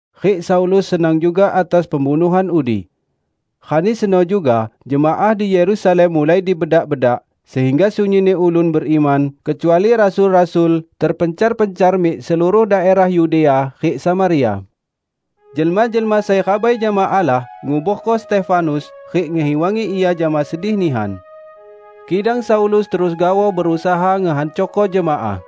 Rik Saulus senang juga atas pembunuhan udi. Rani seno juga jemaah di Yerusalem mulai dibedak-bedak, sehingga sunyinni ulun beriman, kecuali rasul-rasul, terpencar-pencar mik seluruh daerah Yudea rik Samaria. Jelma-jelma sai rabai jama Allah nguborko Stefanus rik ngehiwangi ia jama sedih nihan. Kidang Saulus terus gaoh berusaha ngehancorko jemaah.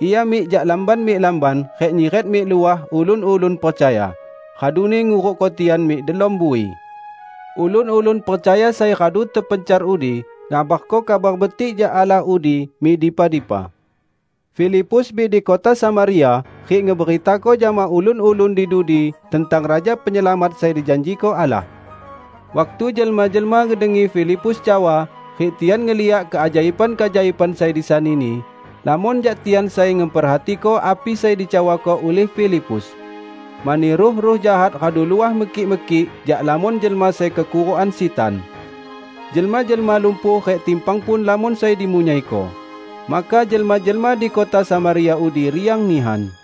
Ia mik jak lamban mik lamban rik nyiret mik luah ulun-ulun percaya, raduni ngurukko tian mik delom bui. Ulun-ulun percaya sai radu terpencar udi ngabarko Kabar Betik jak Allah udi mik dipa-dipa. Filipus mik di kota Samaria rik ngeberitako jama ulun-ulun di dudi tentang Raja Penyelamat sai dijanjiko Allah. Waktu jelma-jelma ngedengi Filipus cawa rik tian ngeliak keajaiban-keajaiban sai disanini, lamon jak tian sai ngeperhatiko api sai dicawako ulih Filipus. Mani ruh-ruh jahat radu luah mekik-mekik jak lamon jelma sai kekurukan sitan. Jelma-jelma lumpuh rik timpang pun lamon sai dimunyaiko. Maka jelma-jelma di kota Samaria udi riang nihan.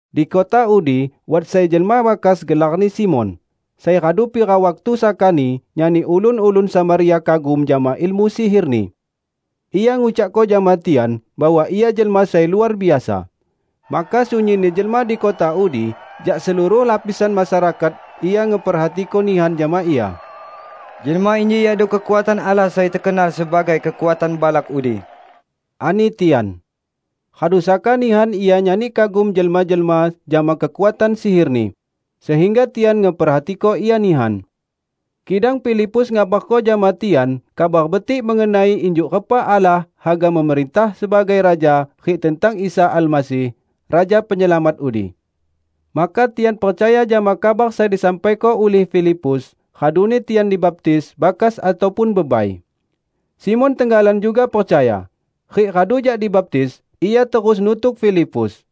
Di kota udi wat sai jelma bakas gelarni Simon, sai radu pira waktu sakani nyani ulun-ulun Samaria kagum jama ilmu sihirni. Ia ngucakko jama tian bahwa ia jelma sai luar biasa. Maka sunyinni jelma di kota udi jak seluruh lapisan masyarakat ia ngeperhatiko nihan jama ia. "Jelma inji yakdo kekuatan Allah sai tekenal sebagai 'Kekuatan Balak' udi," ani tian. Radu saka nihan ia nyani kagum jelma-jelma jama kekuatan sihirni, sehingga tian ngeperhatiko ia nihan. Kidang Filipus ngabarko jama tian Kabar Betik mengenai injuk repa Allah haga memerintah sebagai raja rik tentang Isa Almasih, Raja Penyelamat udi. Maka tian percaya jama kabar sai disampaiko ulih Filipus, raduni tian dibaptis -- bakas ataupun bebai. Simon tenggalan juga percaya. Rik radu jak dibaptis, ia terus nutuk Filipus.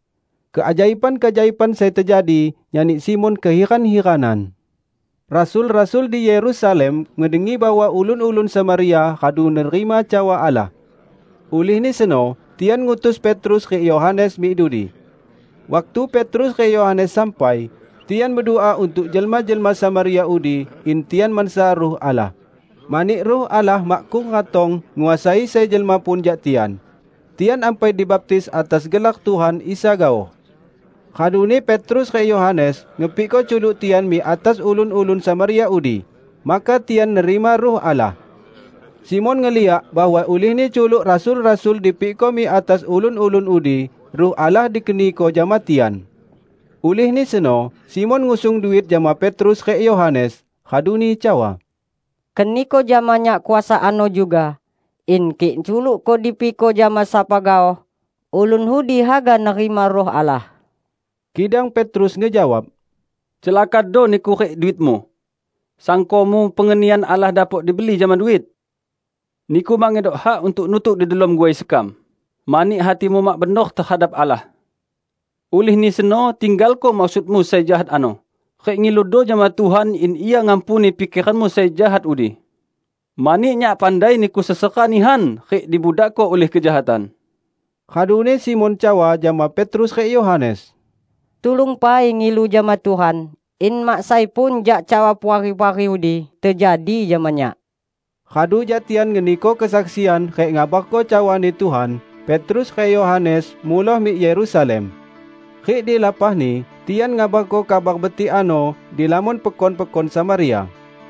Keajaiban-keajaiban sai tejadi nyani Simon kehiran-hiranan. Rasul-rasul di Yerusalem ngedengi bahwa ulun-ulun Samaria radu nerima cawa Allah. Ulihni seno tian ngutus Petrus rik Yohanes mik dudi. Waktu Petrus rik Yohanes sampai, tian bedua untuk jelma-jelma Samaria udi in tian mansa Ruh Allah, mani Ruh Allah makkung ratong nguasai sai jelma pun jak tian; tian ampai dibaptis atas gelar Tuhan Isa gaoh. Raduni Petrus rik Yohanes ngepikko culuk tian mik atas ulun-ulun Samaria udi; maka tian nerima Ruh Allah. Simon ngeliak bahwa ulihni culuk rasul-rasul dipikko mik atas ulun-ulun udi, Ruh Allah dikeniko jama tian. Ulihni seno Simon ngusung duit jama Petrus rik Yohanes, raduni cawa, "Keniko jama nyak kuasa ano juga in kik culukku dipikko jama sapa gaoh, ulun udi haga nerima Ruh Allah." Kidang Petrus ngejawab, "Celakado niku rik duitmu! Sangkomu pengenian Allah dapok dibeli jama duit? Niku mak ngedok hak untuk nutuk di delom guai sekam, mani hatimu mak benor tehadap Allah. Ulihni seno tinggalko maksudmu sai jahat ano, rik ngiludo jama Tuhan in Ia ngampuni pikeranmu sai jahat udi! Mani nyak pandai niku sesera nihan rik dibudakko ulih kejahatan." Raduni Simon cawa jama Petrus rik Yohanes, "Tulung pai ngilu jama Tuhan in mak sai pun jak cawa puari-puari udi tejadi jama nyak." Radu jak tian ngeniko kesaksian rik ngabarko cawani Tuhan, Petrus rik Yohanes muloh mik Yerusalem. Rik di lapahni, tian ngabarko Kabar Betik ano di lamon pekon-pekon Samaria.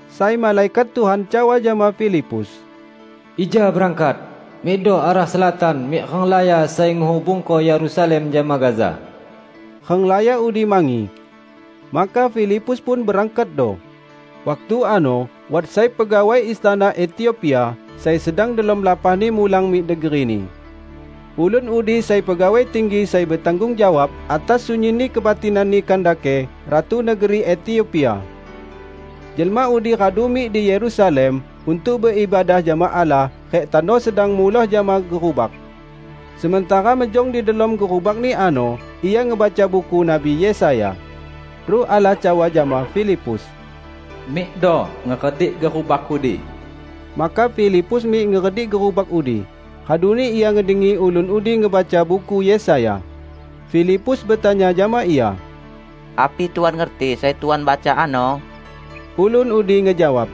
Sai malaikat Tuhan cawa jama Filipus, "Ija berangkat! Mikdo arah selatan mik renglaya sai ngehubungko Yerusalem jama Gaza." Renglaya udi mangi. Maka Filipus pun berangkatdo. Waktu ano wat sai pegawai istana Etiopia sai sedang delom lapahni mulang mik negerini. Ulun udi sai pegawai tinggi sai betanggung jawab atas sunyinni kebatinanni Kandake, ratu negeri Etiopia. Jelma udi radu mik di Yerusalem untuk beibadah jama Allah rik tano sedang muloh jama gerubak. Sementara mejong di delom gerubakni ano ia ngebaca Buku Nabi Yesaya. Ruh Allah cawa jama Filipus, "Mikdo ngeredik gerubak udi." Maka Filipus mik ngeredik gerubak udi, raduni ia ngedengi ulun udi ngebaca Buku Yesaya. Filipus betanya jama ia, "Api Tuan ngerti sai Tuan baca ano?" Ulun udi ngejawab,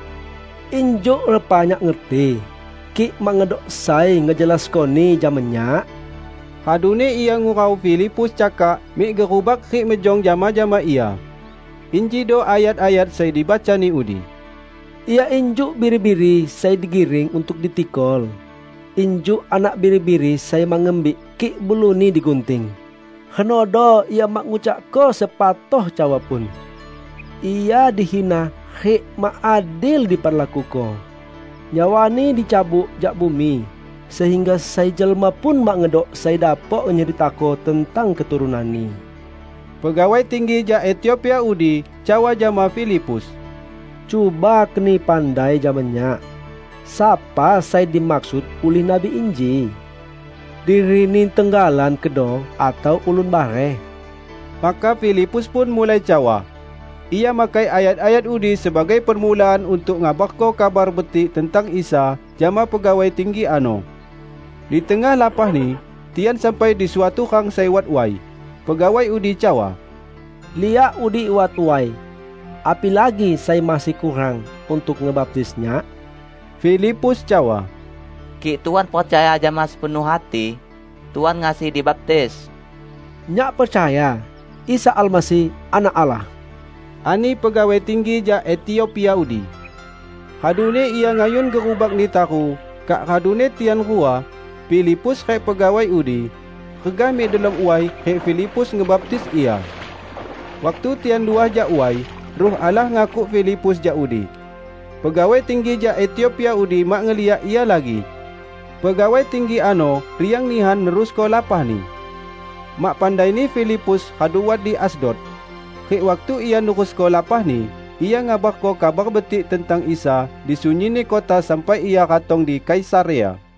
"Injuk repa nyak ngerti, kik mak ngedok sai ngejelaskoni jama nyak?" Raduni ia ngurau Filipus cakak mik gerubak rik mejong jama-jama ia. Injido ayat-ayat sai dibacani udi, "Ia injuk biri-biri sai digiring untuk ditikol, injuk anak biri-biri sai mak ngembik kik buluni digunting, renodo Ia mak ngucakko sepatoh cawa pun. Ia dihina rik mak adil diperlakuko. Nyawa-Ni dicabut jak bumi sehingga sai jelma pun mak ngedok sai dapok nyeritako tentang keturunan-Ni." Pegawai tinggi jak Etiopia udi cawa jama Filipus, "Cuba keni pandai jama nyak, sapa sai dimaksud ulih nabi inji? Dirini tenggalan kedo atau ulun bareh?" Maka Filipus pun mulai cawa; ia makai ayat-ayat udi sebagai permulaan untuk ngabarko Kabar Betik tentang Isa jama pegawai tinggi ano. Di tengah lapahni, tian sampai di suatu rang sai wat way. Pegawai udi cawa, "Liak udi wat way! Apilagi sai masih kurang untuk ngebaptis nyak?" [ Filipus cawa, "Kik Tuan percaya jama sepenuh hati, Tuan ngasi dibaptis." "Nyak percaya Isa Almasih Anak Allah," ani pegawai tinggi jak Etiopia udi.] Raduni ia ngayun gerubakni taru; kak raduni tian rua, Filipus rik pegawai udi, regah mik delom way rik Filipus ngebaptis ia. Waktu tian luah jak way, Ruh Allah ngakuk Filipus jak udi. Pegawai tinggi jak Etiopia udi mak ngeliak ia lagi. Pegawai tinggi ano riang nihan nerusko lapahni. Mak pandaini Filipus radu wat di Asdod. Rik waktu ia nerusko lapahni, ia ngabarko Kabar Betik tentang Isa di sunyinni kota sampai ia ratong di Kaisarea.